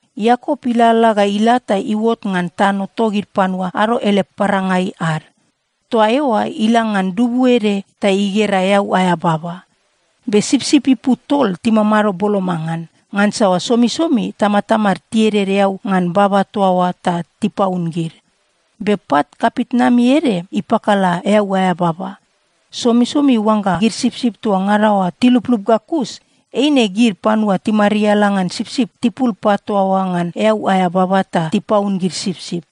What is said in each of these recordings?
Iakop ilalala ga ila ta iuot ngan tano togid panua ado ele parangai ad. Toa eoa ila ngan dubu ede ta igera eau aea baba. Be sipsip ipu tol timamado boloma ngan, ngansa somisomi tamatamad tieded eau ngan baba toa oa ta tipaun gid. Be pat kapitnami ede ipakala eau aea baba. Somisomi oangga gid sipsip toa ngada oa tiluplup ga kus, eine gid panua timariala ngan sipsip tipul pat toa oa ngan eau aea baba ta tipaun gid sipsip.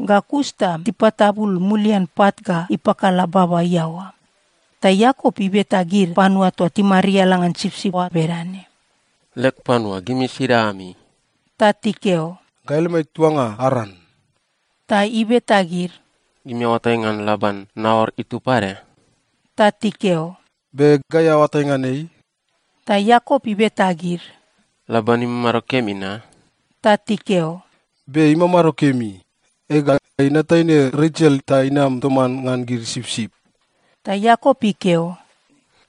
Ga kus ta tipatabul mulian pat ga ipakala baba iaoa. Ta Iakop ibeta gid panua toa timariala ngan sipsip oa bedane, “Leg panua, gimi sida ami?” Ta tikeo, “Gai lemai tuanga Aran.” Ta ibeta gid, “Gimi aoatai ngan Laban, Naor itub pade?” Ta tikeo, “Be. Gai aoatai ngan ei.” Ta Iakop ibeta gid, “Laban imamado kemi na?” Ta tikeo, “Be. Ei imamado kemi. Ega, inat taine Resel ta inam toman ngan gid sipsip.” Ta Iakop ikeo,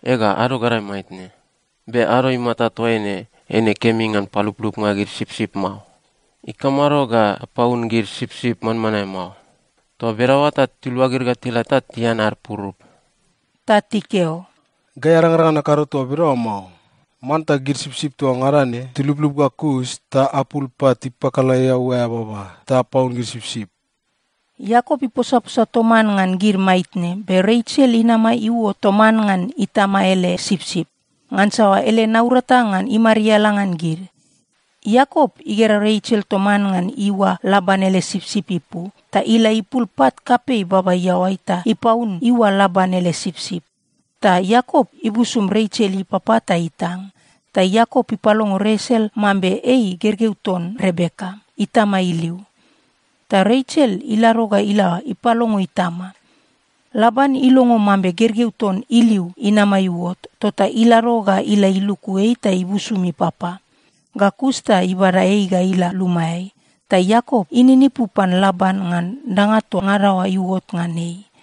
“Ega, ado gadae maitne. Be ado imata toaine eine kemi ngan paluplupnga gid sipsip mao. Ikamado ga apaun gid sipsip manmanae mao? Toa bedaoa ta tiluagid ga tila ta tian ad purup.” Ta tikeo, “Gai arangrang ngan akado toa bedaoa mao. Manta gid sipsip toa ngada ne tiluplup ga kus ta apul pat ipakala eau aea baba ta apaun gid sipsip.” Iakop iposaposa toman ngan gid maitne, be Resel inama iuot toman ngan itama ele sipsip, ngansa ele naurata ngan imariala ngan gid. Iakop igera Resel toman ngan iua Laban ele sipsip ipu, ta ila ipul pat kapei baba iaoai ta ipaun iua Laban ele sipsip. Ta Iakop ibusum Resel ipapa ta itang. Ta Iakop ipalongo Resel mambe ei gergeu ton Rebeka, itama iliu. Ta Resel ilado ga ila ipalongo itama. Laban ilongo mambe gergeu ton iliu inama iuot, tota ilado ga ila iluku ei ta ibusum ipapa. Ga kus ta ibada ei ga ila lumaeai. Ta Iakop ininipu pan Laban ngan danga toa ngada oa iuot ngan ei.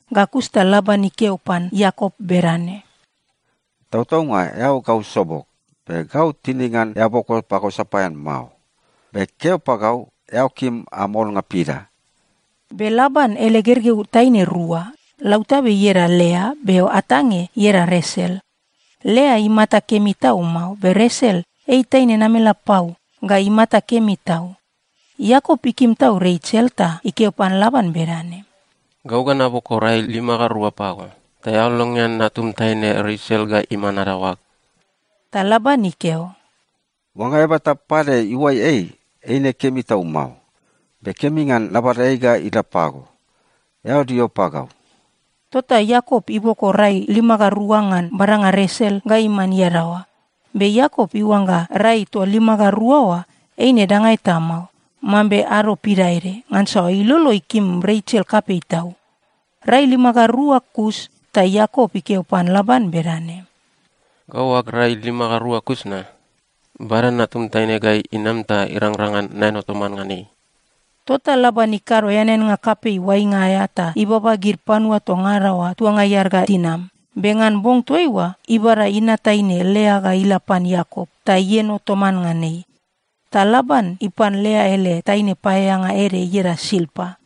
Ga kus ta Laban ikeo pan Iakop bedane, “Tautaunga eao gau sobog, be gau tinig ngan eao boko pagau sapaean mao. Be keo pagau, eao kim am olnga pida?” Be Laban ele gergeu taine rua. Lautabe ieda Lea, be atange ieda Resel. Lea imata kemi tau mao, be Resel ei taine namelapau ga imata kemi tau. Iakop ikim tau Resel ta ikeo pan Laban bedane, “Gau ga naboko rai lima ga rua pago, ta eao longean natum taine Resel ga iman adaoag.” Ta Laban ikeo, “Oangga eaba eta pade iuai ei, eine kemi tau mao. Be kemi ngan nabada ei ga ila pago. Eao dio pagau.” Tota Iakop iboko rai lima ga rua ngan badanga Resel ga iman iadaoa. Be Iakop iuangga rai toa lima ga rua oa, eine danga eta mao, mambe ado pidaede, ngansa ilolo ikim Resel kapei tau. Rai lima ga rua kus ta Iakop ikeo pan Laban bedane, “Gau ag rai lima ga rua kus na. Bada natum taine ga inam ta irangrang ngan naeno toman ngan ei.” Tota Laban ikado eaneannga kapei oainga aea ta ibaba gid panua toa ngada oa tuangai ad ga tinam. Be ngan bong toaiua, ibada inat taine Lea ga ila pan Iakop, ta ieno toman ngan ei. Ta Laban ipan Lea ele taine paeaeanga ede ieda Silpa.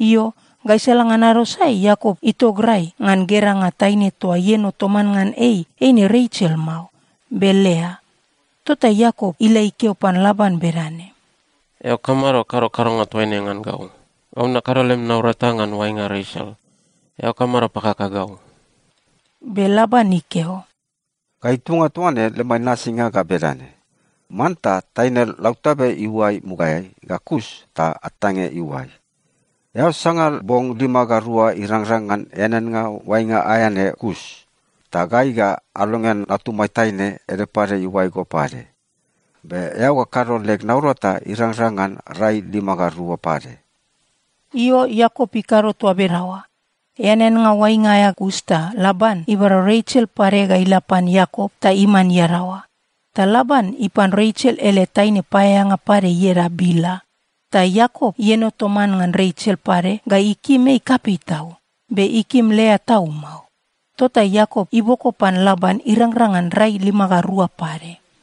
Io, gaisala ngan ado sae, Iakop itograi ngan geranga taine toa ieno toman ngan ei. Eine Resel mao, be Lea! Tota Iakop ila ikeo pan Laban bedane, “Eao kamado kado kadonga toaine ngan gau? Gau nakado lem naurata ngan oainga Resel. Eao kamado pakaka gau?” Be Laban ikeo, “Gai tuanga toa ne lemai nasinga ga bedane: Manta taine lautabe iuai mugaeai, ga kus ta atange iuai. Eao sanga bong lima ga rua irangrang ngan eaneannga oainga aea ne kus. Ta gai ga alongean natumai taine ede pade iuai go pade. Be eao ga kado leg naurata irangrang ngan rai lima ga rua pade.” Io, Iakop ikado toa bedaoa. Eaneannga oainga aea kus ta Laban ibada Resel pade ga ila pan Iakop ta iman iadaoa. Ta Laban ipan Resel ele taine paeaeanga pade ieda Bila. Ta Iakop ieno toman ngan Resel pade ga ikim ei kapei tau. Be ikim Lea tau mao. Tota Iakop iboko pan Laban irangrang ngan rai lima ga rua pade.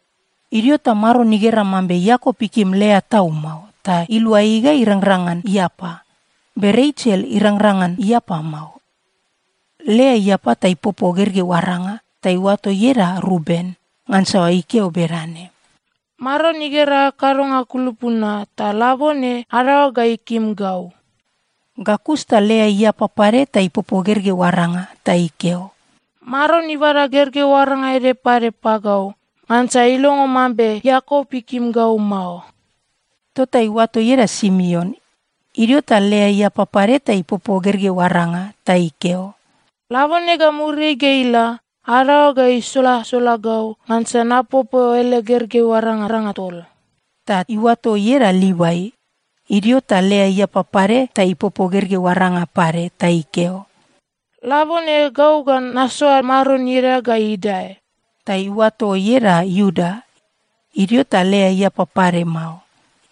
Idio ta Maron igera mambe Iakop ikim Lea tau mao, ta ilua ei ga irangrang ngan iapa. Be Resel irangrang ngan iapa mao. Lea iapa ta ipopo gergeu aranga. Ta iuato ieda Ruben, ngansa ikeo bedane, “Maron igera ag kadonga kulupu na. Ta labone adaoag ga ikim gau.” Ga kus ta Lea iapa pade ta ipopo gergeu aranga. Ta ikeo, “Maron ibada gergeu aranga ede pade pagau, ngansa ilongo mambe Iakop ikim gau mao.” Tota iuato ieda Simeon. Idio ta Lea iapa pade ta ipopo gergeu aranga. Ta ikeo, “Labone ga muriai ga ila, adaoag ga isolasola gau, ngansa napopo ele gergeu arangaranga tol.” Ta iuato ieda Livai. Idio ta Lea iapa pade ta ipopo gergeu aranga pade. Ta ikeo, “Labone gau ga nasoa Maron ieda ga idae.” Ta iuato ieda Iuda. Idio ta Lea iapa pade mao.